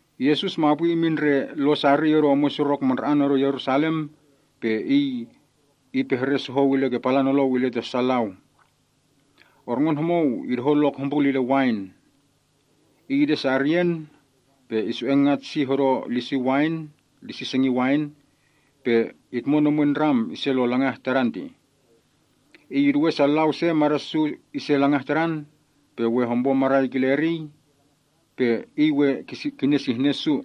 Yesus mapwi imin ndre lon sariy odo omwen surok mandra‑an odo Yerusalem pe Iy ipehre sohou ile ke palan nolou ile ta su lau ihpah, “Orngon homou idohon lok hombrul ile wain. Iy ide sariyen, pe isu‑ei ngat sih odo lisi sengin wain, pe itmon omwen ndram ise lo langah tadan tih. Iy iduwe sa lau se mada’ su ise langah tadan, pe we hompo marai kile eriy, pe iy we kinesihnen su.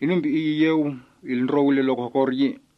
Inum pe iy iyeu ilndrou ile lok hokor yi.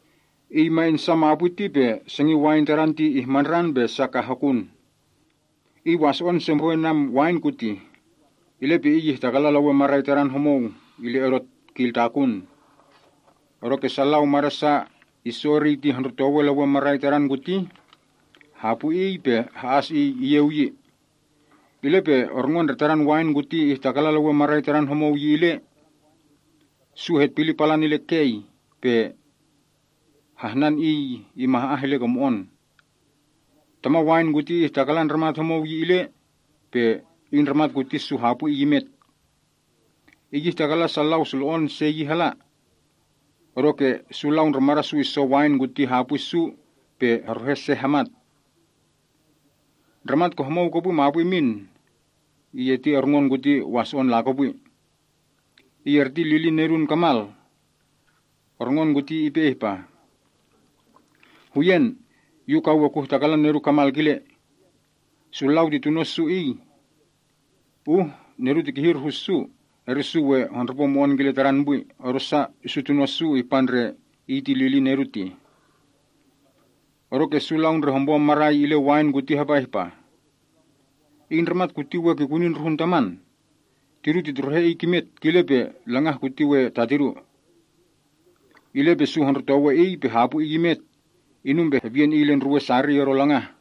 “Iy ma insa mapwi ti pe sengin wain tadan ti ihmandran pe sa ka hokun. Iy waso‑on se mbrwen wain kuti, ile pe iy ihtakalan lewen marai tadan homou ile odo kiltakun. Odoke sa lau mada’ sa isso eriy ti hondrotowe lewen marai tadan kuti, hapwi iy, pe ha‑as iy iyeu yi. Ile pe orngon ndre tadan wain kuti ihtakalan lewen marai tadan homou yi ile. Su hetpili palan ile kei, pe hahnan iy imah‑ah ile ke mo‑on. Taman wain kuti ihtakalan ndramat homou yi ile, pe iy ndramat kuti su hapwi iy imet. Iy ihtakalan sa lau sulo‑on se yi hala, odoke su lau ndre mada’ su iso wain kuti hapwi su se pe heruhe se hamat. “Ndramat ke homou kopwi mapwi imin ti orngon kuti waso‑on lakopwi. Iy erti lilin nedun kamal. Orngon kuti ipe ihpah, ‘Huyen, yu ka we kuhtakalan nedu kamal kile. Su lau ti tuno’ su iy. Uh nedu ti kihir hu su ti we su hondrupo mo‑on kile tadan pwi, odosa su tuno’ su ihpa ndre iy ti lilin nedu tih.’ “Odoke su lau ndre hompo marai ile wain kuti hapa ihpah, ‘Iy ndramat kuti we kikuni ndruhun taman. Tidu titruhe iy kimet, kile pe langah kuti we ta tidu.’ Ile pe su hondrotowe iy pe hapwi iy imet, inum pe hepiyen iy ile ndruwen sariy odo langah.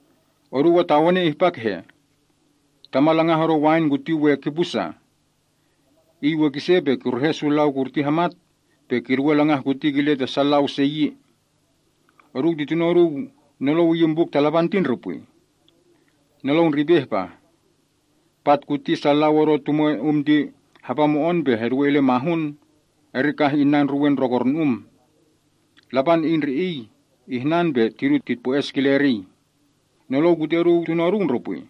“Oduu atawene ihpa kehe? Taman langah odo wain kuti we kipu sa? Iy we kise pe kiruhe su lau kurti hamat pe kiduwe langah kuti kile ta sa lau se yi. Oduu ti tuno’ oduu nolou iyin Buk ta Lapan ti ndre pwi? Nolou ndre ipe ihpah, “‘Pat kuti sa lau odo tumwe um ti hapa mo‑on pe heduwei ile mahun, eri kah inna ndruwen ndrokornu‑um. Lapan Iy ndre Iy ihnan pe tidu titpwo-es kile eriy.’ “Nolou kuti oduu tuno’ oduu ndre pwi?”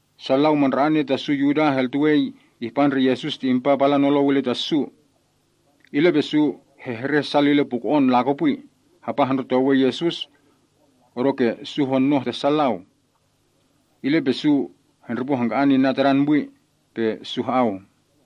Sa lau mandra‑asa ta su Yuda heltuwe ihpa ndre Yesus ti impa palan nolou ile ta su. Ile pe su hehreh sal ile puko‑on lakopwi hapa hondrotowe Yesus, odoke su honoh ta sa lau. Ile pe su hendripo hangka‑an inna Tadan pwi, pe su ha‑au.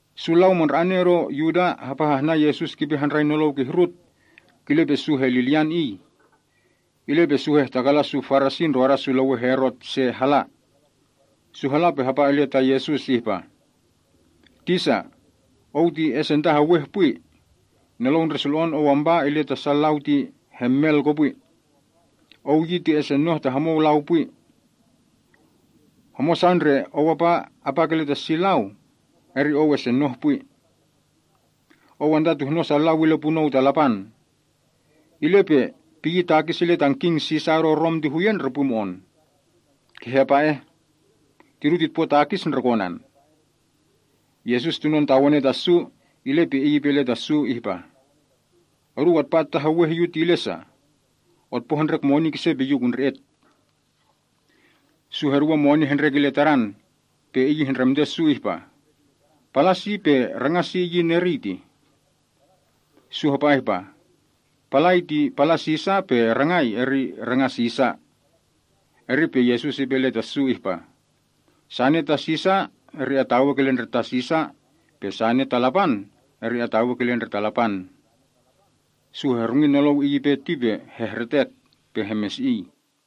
Su lau mandra‑ane odo Yuda hapa hahnan Yesus kipe handrai nolou kihrut, kile pe su helilyan Iy. Ile pe su hahtakalan su Paraseo ndroda su lewen Herot se hala. Su hala pe hapa ile ta Yesus ihpa, “Tisa, Ou ti esentaheweh pwi. Nolou ndre sulo‑on Ou ampa ile ta sa lau ti hemel kopwi. Ou ti esenoh ta homou lau pwi yi. Homosa ndre Ou apa apa kile ta si lau, eri Ou esenoh pwi. Ou antatuhnon sa lau ile punou ta Lapan. Ile pe piyi takis ile tan king Sisar odo Rom ti huyen ndre mo‑on? Kehe apa eh? Tidu titpo takis ndre konan?” Yesus tunon tawene ta su, ile pe Iy ipe ile ta su ihpah, “Oduu atpa ataheweh Yu ti ile sa? Otpo hendrek moni kise pe Yu kundre‑et.” Su heduwe moni hendrek ile Tadan. Pe Iy ihndremte su ihpah, “Palan si pe rangan si iyin eriy tih?” Su hahpah, “Palai ti palan Sisar pe rangai ti rangan Sisar.” Eri pe Yesus ipe ile ta su ihpah, “Sane ta Sisar ti atawei kile ndre ta Sisar, pe sane ta Lapan ti atawei kile ndre ta Lapan.” Su hehrungi nolou Iy ipe ti pe hehretek pe hemesi‑iy.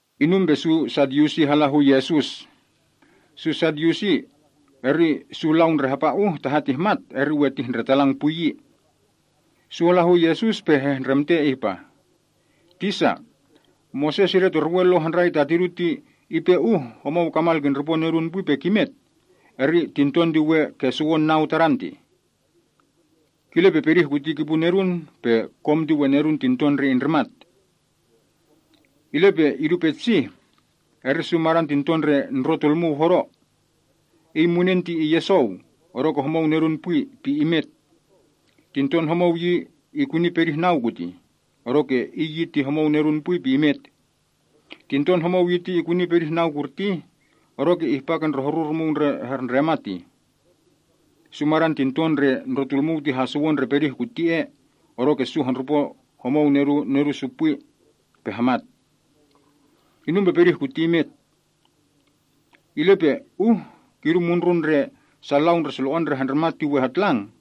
Inum pe su Sadyusi hala hu Yesus. Su Sadyusi ti su lau ndre hapa uh, taha tihmat, eri we titndretalang pwi yi. Su hala hu Yesus pe hehndremte ihpah, “Tisa, Moses idetorwe Lo handrai ta tidu ti ipe uh homou kamal kindripo nedun pwi pe kimet, eri tinton ti we kesuwon nau tadan tih. Kile pe pedih kuti kipu nedun, pe kom ti we nedun tinton ndre indrimat tih. Ile pe idu petsih, eri su madan tinton ndre ndrotulmuu hodo. Iy munen ti iyesou, odoke homou nedun pwi pe imet. Tinton homou yi ti ikuni pedih nau kutih, odoke iy yi ti homou nedun pwi pe imet. Tinton homou yi ti ikuni pedih nau kurtih, odoke ihpa ke horu rumuu ndre herndremat tih. Su madan tintoi ndre ndrotulmuu ti hasuwon ndre pedih kuti ea, odoke su homou indripo homou nedun pwi pe hamat. Inum pe pedih kuti imet yi. Ile pe uh kidu mundrun ndre sa lau ndre sulo‑on ndre handrimat ti we hatlang yi,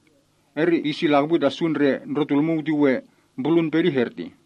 eri iy si lakopwi ta su ndre ndrotulmuu ti we mbrulun pedih ertih?”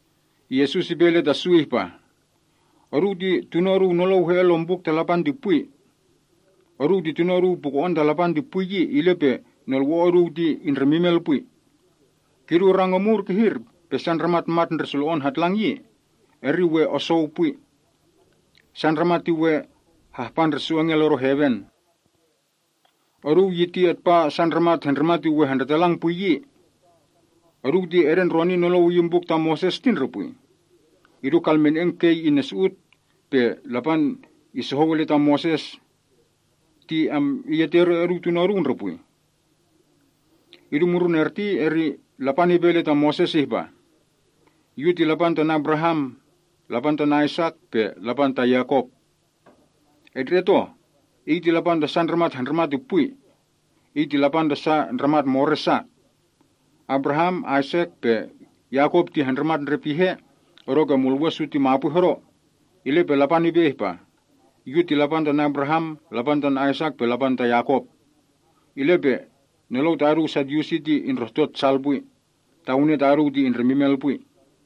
Yesus ipe ile ta su ihpah, “Oduu ti tuno’ oduu nolou he‑en lon Buk ta Lapan ti pwi. Oduu ti tuno’ oduu puko‑on ta Lapan ti pwi yi, ile pe nolwo‑o’ oduu ti indremimel pwi. Kidu rang omur kihir pe sa ndramat mat ndre sulo‑on hatlang yi, eri we osou pwi. Sa ndramat ti we hahpa ndre su engel odo heven. Oduu yi ti atpa sa ndramat handrimat ti we handretalang pwi yi. Oduu ti edendroni nolou iyin buk ta Moses ti ndre pwi? Idu kalmene‑en kei innul pe Lapan isohou ile ta Moses ti oduu tuno’ oduu ndre pwi? Idu mundrun erti eri Lapan ipe ile ta Moses ihpa, ‘Yu ti Lapan tan Abraham, Lapan tan Aisak, pe Lapan ta Yakop.’ Etndre‑et oh, Iy ti Lapan ta sa ndramat handrimat ti pwi. Iy ti Lapan ta sa ndramat more’ sa. Abraham, Aisak pe Yakop ti handrimat ndre pihe odoke mulwe’ su ti mapwi hodo, ile pe Lapan ipe ihpah, ‘Yu ti Lapan tan Abraham, Lapan tan Aisak pe Lapan ta Yakop.’ Ile pe nolou ta oduu Sadyusi ti indrohtot sal pwi. Tawene ta oduu ti indremimel pwi!”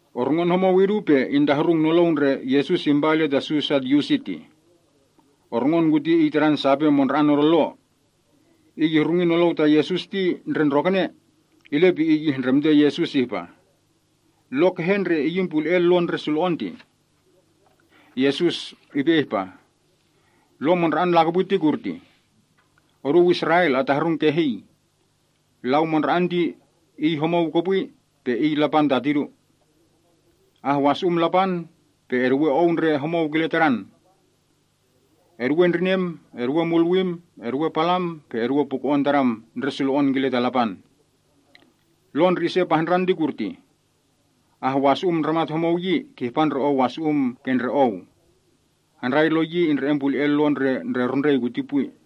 Orngon homou idu pe intahrung nolou ndre Yesus impa ile ta su Sadyusi tih. Orngon kuti tadan sape mandra‑an odo Lo. Iy ihrungi nolou ta Yesus ti ndre ndrokene, ile pe iy ihndremte Yesus ihpah, “Lo kehe ndre iyin pule‑en Lo ndre sulo‑on tih?” Yesus ipe ihpah, “Lo mandra‑an lakopwi ti kurtih: ‘Oduu Israel atahrung kehii. Lau Mandra‑an ti Iy homou kopwi, pe Iy Lapan ta tidu. Ahwasu‑um Lapan, pe eduwe ou ndre homou kile Tadan. Eduwe ndrinem, eduwe mulwim, eduwe palam, pe eduwe puko‑on tadam ndre sulo‑on kile ke ta Lapan.’ Lo ndre ise pahndran ti kutih: ‘Ahwasu‑um ndramat homou yi ti kihpa ndre ou wasu‑um ke ndre ou.’ Handrai Lo yi indre‑en pule‑en Lo ndre rundrei kuti pwi.”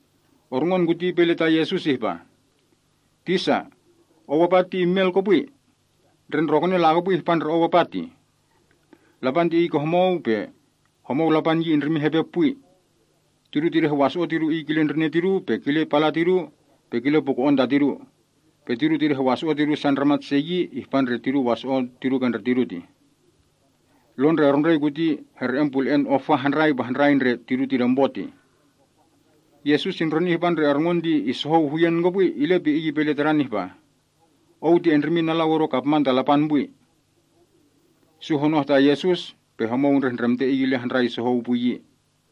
Orngon kuti ipe ile ta Yesus ihpa, “Tisa, Ou apa ti imel kopwi. Ndre ndrokene lakopwi ihpa ndre Ou apa tih. Lapan ti Iy ke homou, pe homou Lapan yi indrimin hepe pwi. Tidu tidehwaso‑o’ tidu Iy kile ndrine’ tidu, pe kile pala’ tidu, pe kile puko‑on ta tidu. Pe tidu tidehwaso‑o’ tidu su ndramat se yi, ihpa ndre tidu waso‑on ke ndre tidu tih. Lo ndre rundrei kuti here‑en pule‑en ofa handrai pe handrai ndre tidu tidempo tih.” Yesus indroni ihpa ndre orngon ti isohou huyen kopwi, ile pe Iy ipe ile tadan ihpah, “Ou ti endrimin alau odo kapman ta Lapan pwi.” Sa honoh ta Yesus, pe homou indrehndremte Iy ile handrai sohou pwi yi.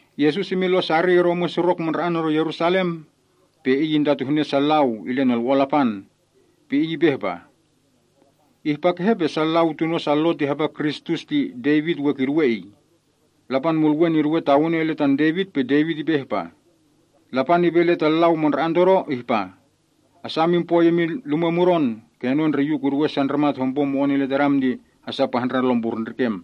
Yesus imin lon sariy odo omwen surok mandra‑an odo Yerusalem, pe Iy intatuhne sa lau ile nolwo‑on Lapan. Pe Iy ipe ihpah, “Ihpa kehe pe sa lau tuno’ sa Lo ti hapa Kristus ti Devit we kiduwe Iy? Lapan Mulwen iduwe tawene ile tan Devit pe Devit ipe ihpah, “‘Lapan ipe ile ta Lau Mandra‑an todo ihpah, “Asa emin poi emin lumwe mudon kenon ndre Yu kuduwe sa ndramat hompo mo‑on ile Tadam ti hasa pahndran lompurndrikem.” ’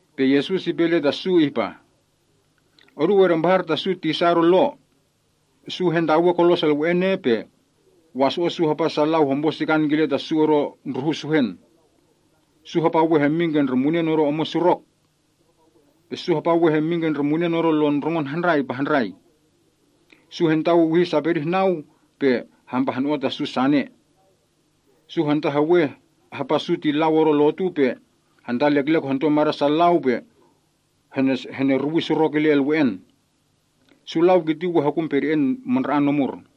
Pe Yesus ipe ile ta su ihpah, “Oduu edempahar ta su tisa odo Lo. Su hentawe kolos elwe‑en ea pe waso‑o’ su hapa sa lau hompo sikan kile ta su odo ndruhun suhen. Su hapa we hemmin ndre munen odo omwen surok. Su hapa we hemmin ndre munen odo lon ndrongon handrai pe handrai. Su hantawiwihi sa pedih nau pe hempahno‑o sane ta su. Su hantaheweh hapa su ti lau odo lotu pe hantaleklek odo mada’ sa lau pe heneruwi surok illa elwe‑en. Su lau kiti we hokun pede‑en mandra‑an omur.”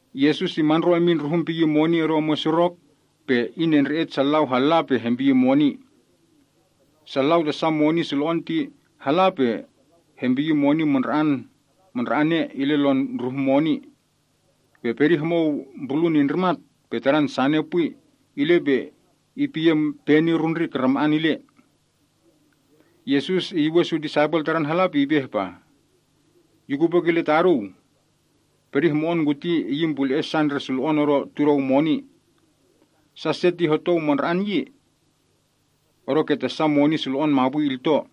Yesus imandro imin ndruhun piyi moni odo omwen surok mandra‑an, pe inendre‑et sa lau halla pe hempiyi moni odo hehnuwii omwen surok ertih. Sa lau ta sa moni sulo‑on ti hala pe hempiyi moni mandra‑ane ile lon ndruhun moni. Pe pedih homou mbrulun indrimat, pe tadan sane pwi eri ile, pe ipiyen peni rundrik rama‑an ile. Yesus iyuwen su disaipel Tadan hala pe ipe ihpah, “Yu kupwe kile ta oduu. Pedih mo‑on kuti ihluwen sa ndre sulo‑on odo tudou moni. Sa se ti hotou mandra‑an yi, odoke ta sa moni sulo‑on mapwi ilto.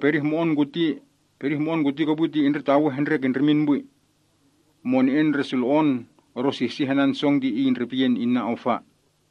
Pedih mo‑on kuti kopwi ti indretawe hendrek indrimin pwi. Mone‑en ndre sulo‑on odo sihsih anan song ti iy indrepiyen inna ofa.”